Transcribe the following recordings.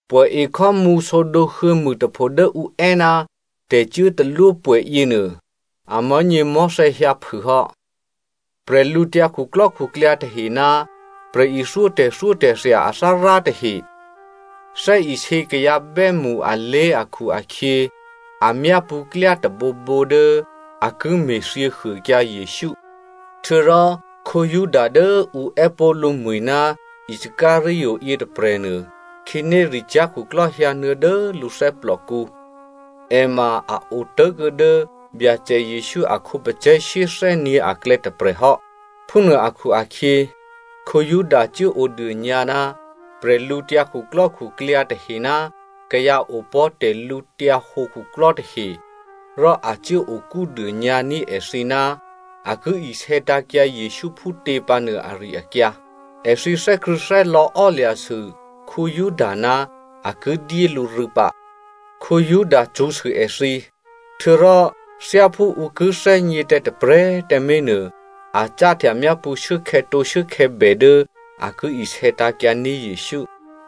Pwè̌ekhò́mǔ sǒdǒ huô̌mûtapho dố ǔ è́ ná tè̤cuốtalwópwè̌ yěnuô, amò̤́nyěmò̤́thè̌ hyǎphû hò́. Bwídukhu tahe ná prè̤ithyó tè̤thyótè̤thya athárá tahe thè́isě kayǎ bè́mṳ alé̤ akhu-akhyě, a myápṳ̌ klyá tôbǒbǒ dố a ki me̤thyěhuôkyǎ Jesǔ. Htuô̌rò Juda dố ǔ è́pó̤ lǔmwi̤ ná Iscariot yětôprè̤nuô, khǐnéricyá̤ khuklò́ hyǎnuô̌ dố lǔ thè́plòkǔ. È ma a otố̤kuô̌ dố Byacè Jesǔ a khǒpacè̤̌ shyéthè́nyě̤ aklè̌ tôprè̤hò́. Phúnuô akhu-akhyě, Juda cuốodônyǎ ná bwídukhu tahe ná kayǎ opò̤́ tè̤lǔhǒdu khuklò́ tahe. Rò a cuốokúdônyǎ ní̤ èthǐ ná a ki isè̌tǎ̤kyǎ Jesǔ phútě pǎnuô ari-akyǎ. Èthǐ thè́krṳ̂̌thè́lò̌ ò́lya̤sû Juda ná a ki dyé lǔ rû̌ pǎ. Juda cṳ̌sû èthǐ. Htuô̌rò thyáphú ǔ ki thè́gně tǎ tôprè̤꤮ tǎmé̤ nuô, a cáhtya myápṳ̌ shuốkhè̌tǒ shuốkhè̌bè dố a ki isè̌tǎ̤kyǎní̤ Jesǔ.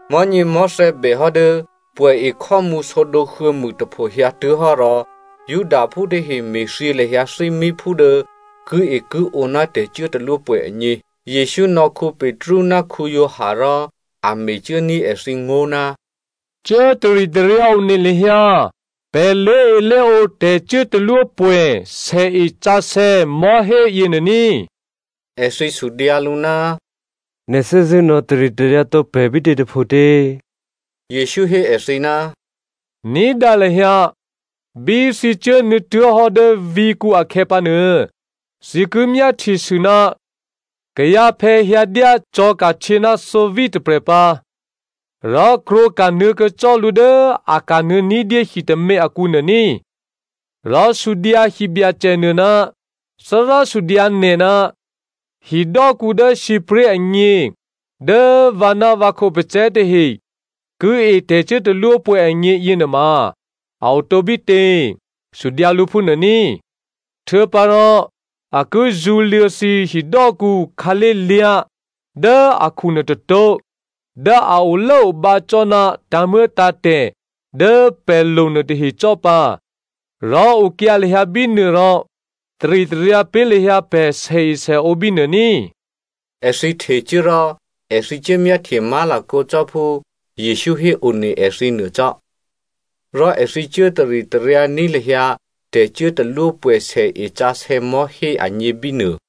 Mò̤́nyěmò̤́thè̌ bèhò́ dố pwè̌ekhò́mǔ sǒdǒ huô̌mûtapho hyǎtuố̤hò́ rò Judaphú tahe me̤thyě lahyǎ thímíphú dố kiekiǒ ná tè̤cuốtalwópwè̌ agně. Jesǔ nò̌ Petru ná Giovanni rò a mecuốní̤ èthǐ ngó̤, “Cuố taritaryǎ one lahyǎ pè̤ lé̤elé̤ǒ tè̤cuốtalwópwè̌ sèesǎsè̌ mò̤́hé yěnuô ní꤮.” Èthǐ sudyǎ lǔ, “Nè̤ thè́zṳ̂́ nò̌taritaryǎ tǒ pè̤ bítě tôphotě?” Jesǔ hé èthǐ, “Ní̤dǎ lahyǎ, bí thǐ cuốnuô̌tuố̤hò́ dố vǐ̤kǔ akhè̌pǎnuô, thǐ ki myáhtyesû ná kayǎphè̌ hyǎdyá cò̤̌ka̤htyě ná thǒví tôprè̤ pǎ. Rò krwǒka̤ nuô̌kuô̌ cò́ lǔ dố a kanuô̌ ní̤dyé hitômě akǔnuô ní꤮. Rò sudyǎ hibyacènuô, ‘Thárá sudyǎ nè̤, hidò́kǔ dố sǐpré̤ agně dố vǎ ná vǎ khǒpacè̤̌ tahe ki e tè̤cuốtalwópwè̌ agně yěnuôma a o tǒbítě?’ Sudyǎ lǔ phúnuô ní. Htuô̌pǎrò a ki zṳ̌luô̌ thǐ hidò́kǔ khǎlé̤lyá̤ dố akhu nuôtôtó̤ dố a olốobǎ cò́ ná tǎ̤muô̌tǎ̤tè̤ dố pè̤ lo nuôtahe cò́ pǎ. Rò okyǎ lahyǎ bínuô rò taritaryǎ pé̤ lahyǎ pè̤ sèesèǒ bínuô ní꤮.” Èthǐ htecuố rò èthǐ cuốmyáhtye má̤lakǒ cò́ phú Jesǔ héone èthǐ nuô cò́. Rò èthǐ cuố taritaryǎní̤ lahyǎ tè̤cuốtalwópwè̌ sèesǎsè̌ mò̤́hé agně bínuô.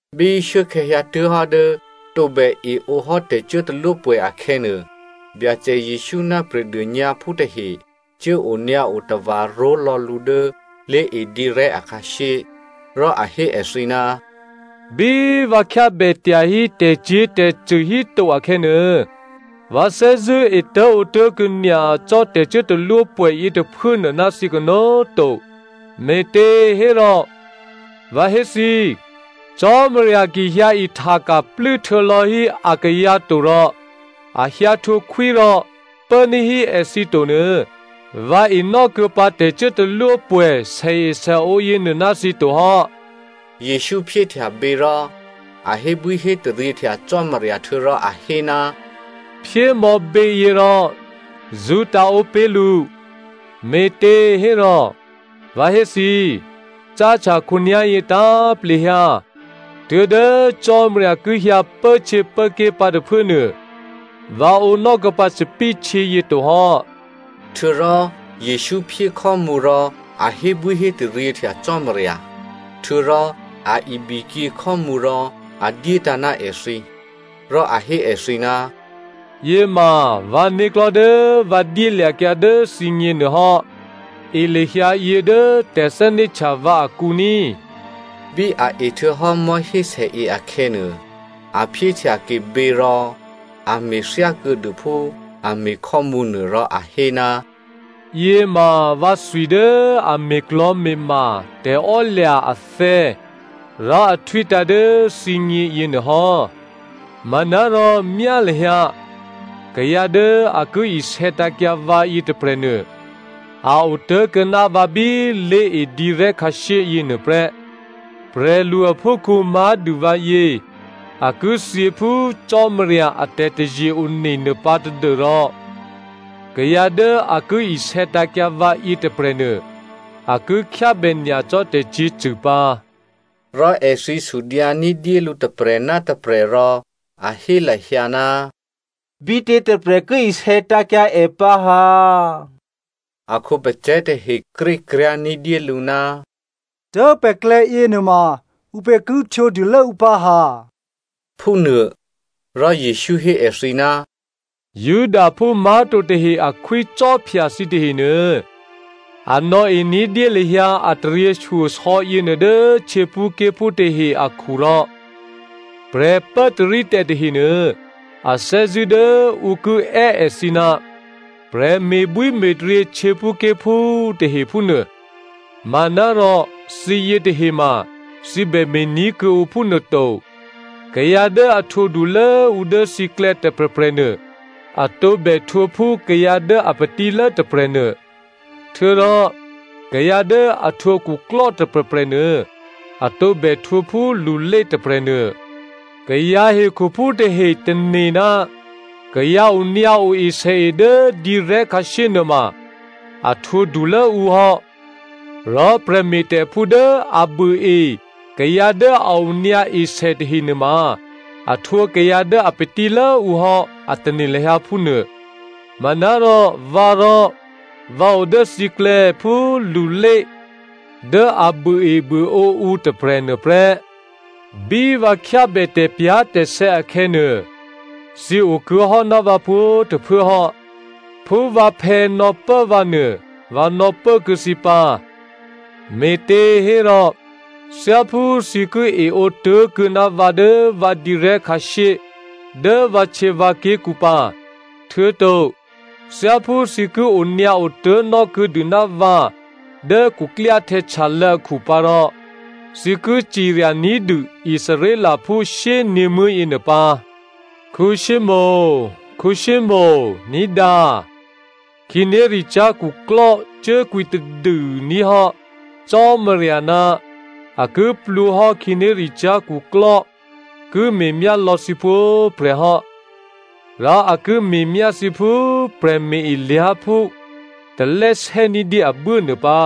Bí shuốkhè̌ hyǎtuố̤hò́ dố tǒbè eǒ hò́ tè̤cuốtalwópwè̌ akhè̌nuô, Byacè Jesǔ ná prè̤dônyǎphú tahe cuố onyǎo tava̤ ró̤lò̌ lǔ dố lé̤edǐrè̤́ akhǎshyé. Rò a hé èthǐ, “Bí vǎ khyábè tyahí tè̤cyě̤tè̤cṳ̂ híto akhè̌nuô, vǎ thè́zṳ̂́ etố̤ǒtố̤kuô̌ nyacò́ tè̤cuốtalwópwè̌ yětôphuốnuô ná thǐ kanó̤꤮ to. Me̤těhérò, vǎ hé thǐ, Cò́marya ki hyǎihtaka̤ plû́htuô̌lò̌ hí akayǎ to rò a hyǎ htwǒkhwí rò pốní̤hí èthǐ tonuô, vǎ enò́kuô̌ pǎ tè̤cuốtalwópwè̌ sèesèǒ yěnuô ná thǐ to hò́.” Jesǔ phyéhtya bě rò a hébwíhétaryěhtya Cò́marya htuô̌rò a hé, “Phyémò̌ běyě rò zṳ́tǎ̤ǒ pé̤ lǔ. Me̤těhérò vǎ hé thǐ, cáhtya khǒnyá̤yě tǎ̤plehyǎ tuố̤dố Cò́marya ki hyǎ pốhtyěpốké̤ pǎ tôphuốnuô, vǎ ǒnò́ kuô̌pǎ thòbǐthèhtyě yě tohò́.” Htuô̌rò Jesǔ phyé khò́mǔ rò a hébwíhétaryěhtya Cò́marya. Htuô̌rò a ibikyě khò́mǔ rò a dyétǎ̤ ná èthǐ. Rò a hé èthǐ, “Yěma vǎ né̤klò̤́ dố vǎ dyélya̤kyǎ dố thǐgně nuôhò́. E lahyǎ yě dố tè̤thè́né̤htya vǎ akǔ ní꤮.” Bí a ehtuô̌hò́ mò̤́hésèe akhè̌nuô, a phyéhtyake běyě rò a me̤ thyákuô̌dû phú a me̤ khò́mǔnuô rò a hé, “Yěma vǎthwi dố a me̤klò̤me̤ma tè̤ò́lya̤ athè̌ rò a htwítǎ̤ dố thǐgně yěnuô hò́. Manárò myá lahyǎ! Kayǎ dố a ki isè̌tǎ̤kyǎ vǎ yětôprè̤nuô, a otố̤kuô̌ ná vǎ bí lé̤edǐrè̤́ khǎshyé yěnuô prè́. Prè̤lu aphúkhǔ má̤dû vǎyě a ki thyě phú Cò́marya a tè̤taze-one nuôpǎ tadû́rò kayǎ dố a ki isè̌tǎ̤kyǎ vǎ yětôprè̤nuô, a ki khyábè nyacò́ tè̤cyě̤cṳ̂ pǎ!” Rò èthǐ sudyǎ ní̤dyé lǔ tôprè̤ ná tôprè̤ rò a hé lahyǎ, bítě tôprè̤ ki isè̌tǎ̤kyǎ è pǎ ha? A khǒpacè̤̌ tahe krékryá̤ ní̤dyélǔ, dố pè̤klè̌ yěnuôma ǔpě ki htwǒdulố ǔ pǎ ha? Phúnuô, rò Jesǔ hé èthǐ, “Judaphú má̤to tahe a khwícò́phya thǐ tahenuô, a nò̌e ní̤dyé lahyǎ a taryěshyosò̌ yěnuô dố htyěphúké̤phú tahe akhu rò prè̤pốtarítè̤ tahenuô, a thè́zṳ̂́ dố ǔ ki è́ èthǐ, ‘Prè̤ me̤bwíme̤taryě htyěphúké̤phú’ tahe phúnuô. Manárò thǐ yětahema thǐ bème̤ ní̤ kuô̌ǔ phúnuôto. Kayǎ dố a htwǒdulố ǔ dố thǐklè̌ tôprè̤prè̤nuô, a tǒbè htwǒ phú kayǎ dố a patílố tôprè̤nuô, htuô̌rò kayǎ dố a htwǒ khuklò́ tôprè̤prè̤nuô, a tǒbè htwǒ phú lulé tôprè̤nuô. Kayǎ hekhuphú tahe tane̤ ná kayǎ onyǎo esèe dố dǐrè̤́ khǎshyé nuôma a htwǒ dulốǔ hò́, rò prè̤me̤tè̤phú dố a buôe kayǎ dố a onyǎ esè nuôtahe ma a htwǒ kayǎ dố a patílốǔ hò́ a tane̤ lahyǎ phúnuô. Manárò, vǎrò vǎ o dố thǐklè̌ phú lulé dố a buôebuôǒ ǔ tôprè̤ nuôprè́. Bí vǎ khyábè tè̤pyá̤tè̤sè̌ akhè̌nuô, thǐ okuô̌hò́ ná vǎ pwǒ̤꤮ tôphuố hò́. Phú vǎphè̌ nò̌pố vǎ nuô, vǎ nò̌pố kuô̌ thǐ pǎ. Me̤těhérò thyáphú thǐ ki eǒ tố̤kuô̌ ná vǎ dố vǎ dǐrè̤́ khǎshyé dố vǎhtyěvǎké̤kǔ pǎ, htuô̌to thyáphú thǐ ki onyǎo tố̤nò́ kuô̌dû ná vǎ dố khuklyáhtè̌ htyalô̌ akhu pǎ rò thǐ ki cirya ní̤dû Israelphú shyényě̤muố̤ yěnuô pǎ. “Simonè, Simonè, ní̤dǎ! Khǐnéricyá̤ khuklò́ cuốkwǐtadû ní̤ hò́ Cò́marya ná a ki plwǒhò́ khǐnéricyá̤ khuklò́ ki me̤myá lò̌ thǐ pwǒ̤prè̤ hò́. Rò a ki me̤myá thǐ phú prè̤me̤-elyá̤phú talè́ sè́ ní̤dyé abuố nuô pǎ.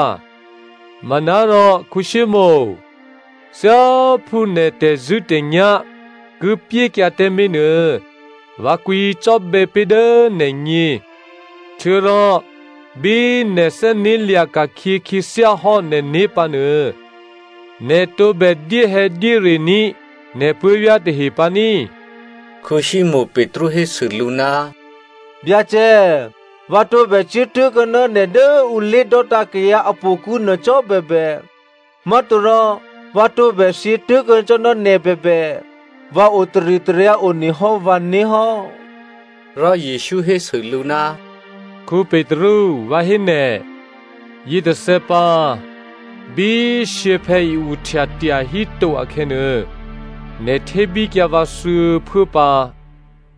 Manárò, Simonè, thyáphú nè̤ tè̤zṳ̂́tè̤nyá̤ ki pyékyǎ tǎmé̤ nuô, vǎ kwǐcò́bè̌ pé̤ dố nè̤gně. Htuô̌rò bí nè̤ thè́né̤lya̤ ka̤khyě khyěthyá hò́ nè̤né̤ pǎnuô, nè̤ tǒbè dyéhè̌dyérení̤ nè̤ puố̤vyá̤ tahe pǎ ní꤮.” Simonè Petru hésû lǔ, “Byacè, vǎ tǒbè cuố tố̤kuô̌ ná nè̤ dố ǔ lé̤dò́tǎ̤ kayǎ a htò̌kǔnuô cò́ bèbè, má̤torò vǎ tǒbè thyě tố̤kuô̌ cò́ ná nè̤ bèbè, vǎ otaritaryǎ one hò́ vǎné̤ hò́.” Rò Jesǔ hésû lǔ, “Petru, vǎ hé nè̤, yětôthè̌ pǎ, bí shyěphè̌ i-uhtya tyahíto akhè̌nuô, nè̤ htébíkyǎ vǎ thuô̌phuố pǎ.”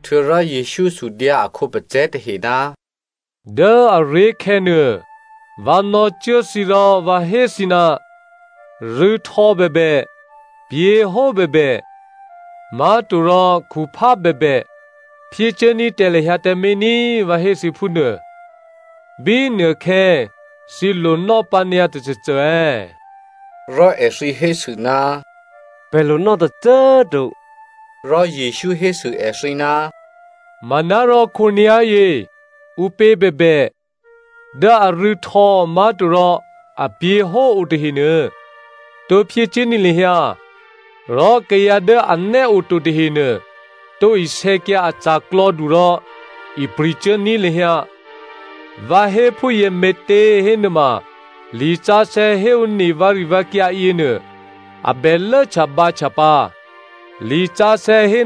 Htuô̌rò Jesǔ sudyǎ a khǒpacè̤̌ tahe, “Dố aré̤khè̌ nuô, vǎ nò̌cuố thǐ rò vǎ hé thǐ, rû̌htò̌ bèbè, pyě̤hó bèbè, má̤torò khuphá bèbè phyécuốní̤ tǎ lahyǎ tǎmé̤ ní꤮, vǎ hé thǐ phúnuô. Bínuôkhè̌ thǐ lonò́ pǎ nyǎ tôcôcô è̌?” Rò èthǐ hésû, “Pè̤ lonò́ tôcô꤮ to.” Rò Jesǔ hésû èthǐ, “Manárò khǒnyá̤yě, ǔpě bèbè dố arû̌htò̌ má̤torò, apyě̤hó otahenuô tǒ phyécuốní̤ lahyǎ, rò kayǎ dố anè́ oto tahenuô tǒ isè̌kyǎ a ca̤klò̌du rò ipri̤cuốní̤ lahyǎ. Vǎ hé phúyě me̤těhénuôma lisǎsè̌ héone vǎrivǎkyǎ yěnuô, a bè lốhtyabǎhtya pǎ. Lisǎsè̌ hé,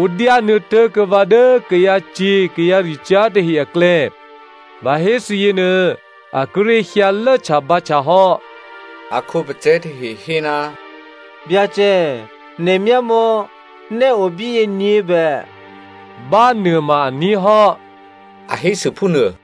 ‘Ǔ dyánuô̌ tố̤kuô̌ vǎ dố kayǎcyě̤ kayǎricyá̤ tahe aklè̌,’ vǎ hé thǐ yěnuô, a kíré̤ hyǎ lốhtyabǎhtya hò́.” A khǒpacè̤̌ tahe hé, “Byacè, nè̤ myámò̌! Nè́ o bíyě nyě̤bè.” “Bánuô ma aní̤ hò́,” a hésû phúnuô.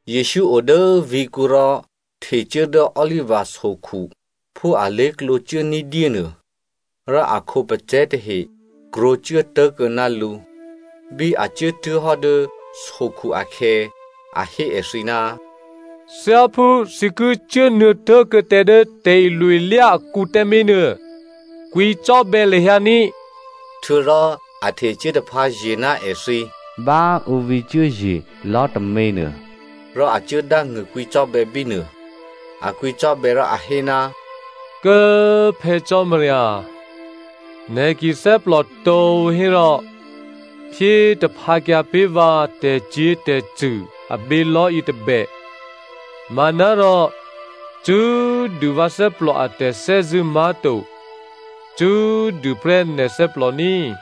Jesǔ o dố vǐ̤kǔ rò htecuố dố Oliva sokhu phú alé̤klǒ cuố ní̤dyé nuô, rò a khǒpacè̤̌ tahe krwǒcuố tố̤kuô̌ ná lǔ. Bí a cuốtuố̤hò́ dố sokhu akhè̌, a hé èthǐ, “Thyáphú thǐ ki cuốnuô̌ tố̤kuô̌ tǎ dố tè̤ilo-ilyá akǔ tǎmé̤nuô, kwǐcò́bè̌ lahyǎ ní꤮.” Htuô̌rò a htecuố taphǎye̤ ná èthǐ bá ǔ vǐcuốye̤ lò̤́ tômě nuô, rò a cuốdángṳ̂ kwǐcò́bè̌ bínuô. A kwǐcò́bè̌ rò a hé, “Kố꤮ Phè̌ Cò́marya, nè̤ ki thè́plò tǒ hérò, phyé taphǎkyǎ pé̤ vǎ tè̤cyě̤tè̤cṳ̂ abělò̤́ yětôbè, manárò cṳ́꤮ dû vǎ thè́plò a tè̤thè́zṳ̂́ má̤to, cṳ́꤮ dû prè́ nè̤ thè́plò ní꤮.”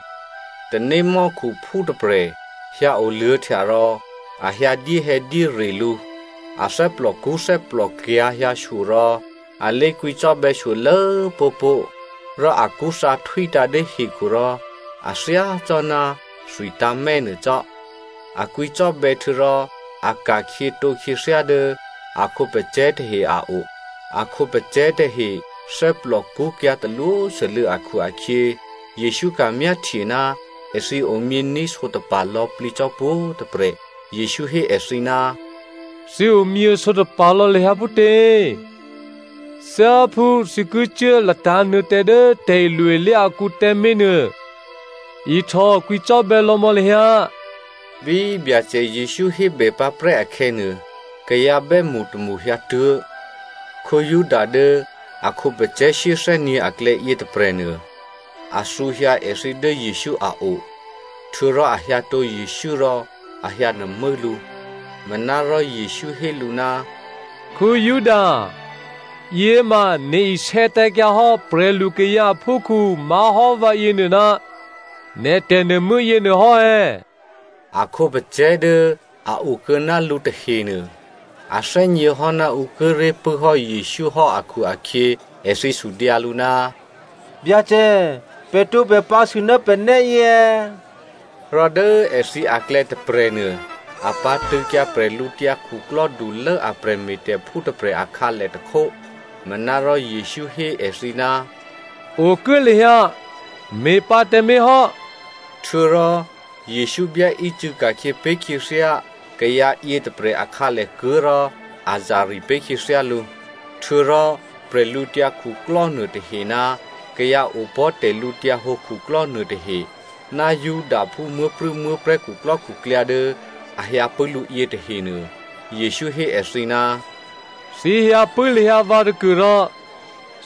Tanémò́khuphú tôprè̤ hyǎ oluô̌htya rò, a hyǎ dyéhè̌dyére lǔ. A thè́plòkṳ́ thè́plòkyǎ̤ hyǎshyo rò, a lé kwǐcò́bè̌ shyolố pó̤pó̤. Rò akṳ́thǎ htwítǎ̤ dố hekhu rò a thyá cò́ ná thwitǎ̤mè̌ nuô cò́. A kwǐcò́bè̌ htuô̌rò a ka̤khyětǒ khyěthyá dố a khǒpacè̤̌ tahe a o. A khǒpacè̤̌ tahe thè́plòkṳ́kyǎ̤ talwósû́lû̌ akhu-akhyě, Jesǔ ka̤myáhtye ná èthǐ omyění̤ sǒtapa̤ lò̌plǐ cò́ pwǒ̤꤮ tôprè̤. Jesǔ hé èthǐ, “Thǐ omyě sǒtapa̤ lò̌ lahyǎ phútě? Thyáphú thǐ ki cuố latǎ̤nuô̌ tǎ dố tè̤ilo-ilyá akǔ tǎmé̤ nuô ihtòkwǐcò́bè̌ lò̌ mò̌ lahyǎ.” Bí Byacè Jesǔ hébè pǎprè́ akhè̌nuô, kayǎ bè́mṳ tômṳ hyǎtuố̤. Juda dố a khǒpacè̤̌ shyéthè́nyě̤ aklè̌ yětôprè̤nuô, a thǔhyǎ èthǐ dố Jesǔ a o, htuô̌rò a hyǎtǒ Jesǔ rò a hyǎnuô̤mû́ lǔ. Manárò Jesǔ hé lǔ, “Juda꤮ yěma nè̤ isè̌tǎ̤kyǎ hò́ prè̤lukayǎ aphúkhǔ má̤hò́ vǎ yěnuô ná nè̤ tè̤nuô̤mû́ yěnuô hò́ è̌?” A khǒpacè̤̌ dố a okuô̌ ná lǔ tahenuô, a thè́gněhò́ ná ǔ kíré̤ pṳ̂́ hò́ Jesǔ hò́ akhu-akhyě, èthǐ sudyǎ lǔ, “Byacè, pè̤ tǒbè pǎ̤sû ná pè̤ nè́yě è̌?” Rò dố èthǐ aklè̌ tôprè̤nuô, a pǎ̤tṳ̂̌kyǎ bwídukhulố a prè̤me̤tè̤phú tôprè̤ akhǎlè tôkhó. Manárò Jesǔ hé èthǐ, “Okuố lahyǎ, me̤pǎ tǎmé̤ hò́” htuô̌rò Jesǔ byáícû̌ ka̤khyě pé̤ khyěthyá kayǎ yětôprè̤ a khǎlèkuố̤ rò a zari̤ pé̤ khyěthyá lǔ. Htuô̌rò prè̤lǔtyǎ khuklò́ nuôtahe ná kayǎ opò̤́ tè̤lǔhǒdu khuklò́ nuôtahe ná Judaphú muố̤prû̌muố̤prè̤́ khuklò́khuklyǎ dố a hyǎpṳ̂́ lǔ yětahenuô, Jesǔ hé èthǐ, “Thǐ hyǎpṳ̂́ lahyǎ vǎ tôkuôrò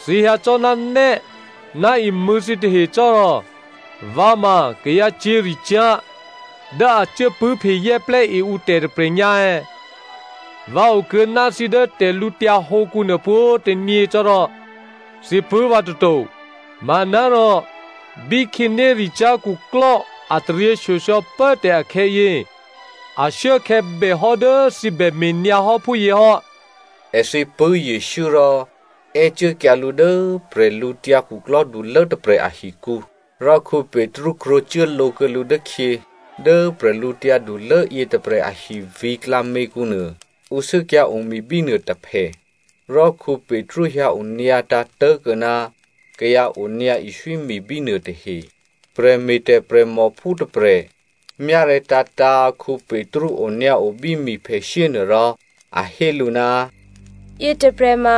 thǐ hyǎ cò́ ná nè́ ná imṳ̂̌ thǐtahe cò́ rò vǎ ma kayǎ cyě̤ricyá̤ dố a cuốpṳ̂́phezè́plè́ e ǔtè̤ tôprè̤ nyǎ è̌? Vǎ okuô̌ ná thǐ dố tè̤lǔtyǎ hǒkǔ nuô pwǒ̤꤮ tônyě cò́ rò thǐ pṳ̂́ vǎ toto, manárò bí khǐnéricyá̤ khuklò́ a taryěshyosò̌ pốtè̤ akhè̌yě, ashuốkhè̌ bèhò́ dố thǐ bè me̤nyǎ hò́ phúyě hò́.” Èthǐ pṳ̂́ Jesǔ rò è́cuốkyǎ lǔ dố bwídukhulố tôprè̤ ahikǔ, rò Petru krwǒcuố lǒ kuô̌ lǔ dốkhyě. Dố prè̤lǔtyǎdulố yětôprè̤ ahi vǐ̤klǎměkǔnuô, ǔ sû́kyǎ̤ o mi bínuô tôphè, rò Petru hyǎonyǎtǎ̤ tố̤kuô̌ ná kayǎ onyǎ iswími bínuô tahe. Prè̤me̤tè̤ prè̤mòphú tôprè̤ myárè̤̌tǎ̤tǎ̤ Petru onyǎo bí miphèshyé nuôrò a hé lǔ, “Yětôprè̤ ma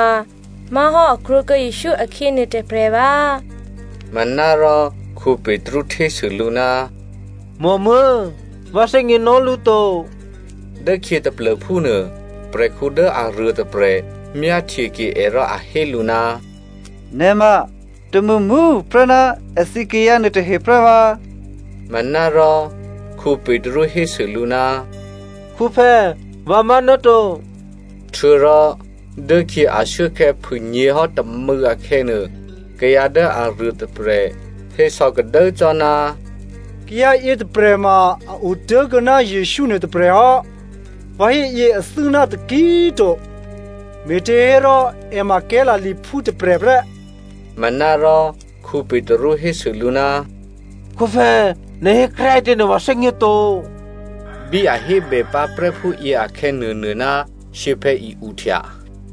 má̤hò́ a krwǒkuô̌ Jesǔ akhyě nuôtôprè̤ vǎ꤮!” Manárò Petru htésû lǔ, “Mòmuố̤! Vǎ thè́gněnò́ lǔ to.” Dốkhyě taplô̤phúnuô, prè̤khǔ dố aruôtôprè̤ myáhtyeke è rò a hé lǔ, “Nè̤ ma tômṳmṳ꤮ tuô̌ prè́ ná èthǐ kayǎ nuôtahe prè́ vǎ!” Manárò Petru hésû lǔ, “Khǔphè̌, vǎ má̤ náto.” Htuô̌rò dốkhyě ashuốkhè̌ phûnyě̤hò́ tômû̌ akhè̌nuô, kayǎ dố aruôtôprè̤, hésò̌kadố cò́, “Kayǎ yětôprè̤ ma a otố̤kuô̌ ná Jesǔ nuôtôprè̤ hò́, vǎ héyě athû́ ná taki꤮ to, me̤těhérò è ma Galileaphú tôprè̤ prè́.” Manárò Petru hésû lǔ, “Khǔphè̌꤮, nè̤ hékryá꤮ ǐtě nuô, vǎ thè́gně to!” Bí a hébè pǎprè́ phúyě akhè̌nuônuô ná shyěphè̌ i-uhtya.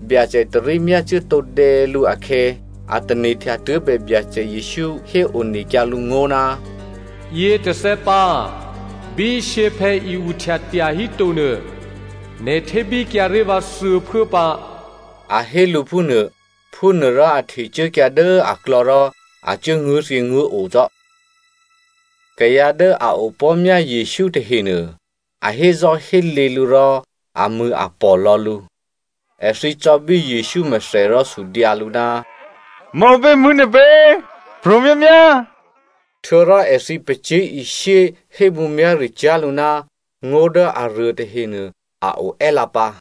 Byacè tarí myácuố tǒdè̌ lǔ akhè̌, a tane̤htya tuố̤bè Byacè Jesǔ héonekyǎ lǔ ngó̤, “Yětôthè̌ pǎ, bí shyěphè̌ i-uhtya tyahíto nuô, nè̤ htébíkyǎré̤ vǎ thuô̌phuố pǎ,” a hé lǔ phúnuô. Phúnuôrò a htecuốkyǎ dố aklò̌ rò a cuố nguố̤thyěnguố̤o cò́. Kayǎ dố a opò̤́myá Jesǔ tahenuô, a hézò́hélě lǔ rò amṳ̂̌apò̤ lò̌ lǔ. Èthǐ cò̌bí Jesǔ mèthè rò sudyǎ lǔ, “Maǔpě mṳ̂̌ nè̤ pě? Pro̤ myámyá!” Htuô̌rò èthǐ pacyé̤ishyé hémǔmyá̤ricyá̤ lǔ ná ngó̤ dố aruôtahe nuô a o è́lǎpǎ.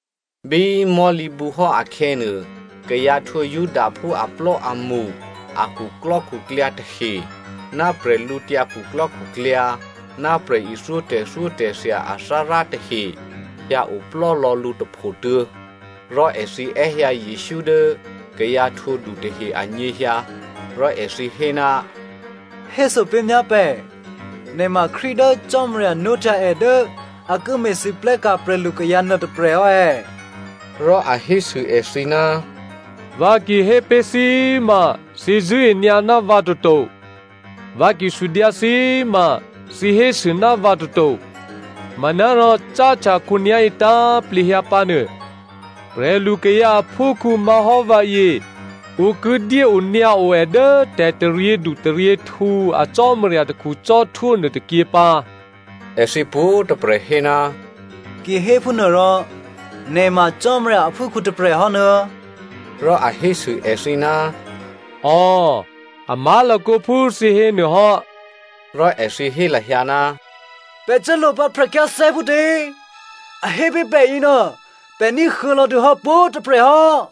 Bí mò̤́lǐbǔhò́ akhè̌nuô, kayǎ htwǒ Judaphú aplò́amṳ a khuklò́khuklyǎ tahe, ná bwídukhu, ná prè̤ithyó tè̤thyótè̤thya athárá tahe hyǎ oplò́lò̌ lǔ tôphotuô̌, rò èthǐ è́hyǎ Jesǔ dố kayǎ htwǒdu tahe anyěhyǎ. Rò èthǐ hé, “Héso pé̤myá pè̤, nè̤ ma Krístu dố Cò́marya nwóhtya è dố a ki me̤lwóhteka̤ prè̤lukayǎ nuôtôprè̤ hò́ è̌?” Rò a hésû èthǐ, “Vǎ ki hé pé̤ thǐ꤮ ma thǐ zṳ̂́e nyǎ ná vǎ toto. Vǎ ki sudyǎ thǐ꤮ ma thǐ hésû ná vǎ toto. Manárò cáhtya khǒnyá̤yě tǎ̤plehyǎ pǎnuô, prè̤lukayǎ aphúkhǔ má̤hò́ vǎyě ǔ ki dyéonyǎo è dố tè̤taryědu taryěhtǔ a Cò́marya takhu cò́htwó nuôtôkyě pǎ.” Èthǐ pwǒ̤꤮ tôprè̤ hé, “Ki héphúnuô rò nè̤ ma Cò́marya aphúkhǔ tôprè̤ hò́ nuô̌?” Rò a hésû èthǐ, “Ò, a má̤lakǒ phú thǐ hé nuô hò́.” Rò èthǐ hé lahyǎ, “Pè̤ cuố lo pǎ prè̤khyáthè́ phútě? A hé pé̤ pè̤ yěnuô, pè̤ ní̤huô̌ lò̌dûhò́ pwǒ̤꤮ tôprè̤ hò́.”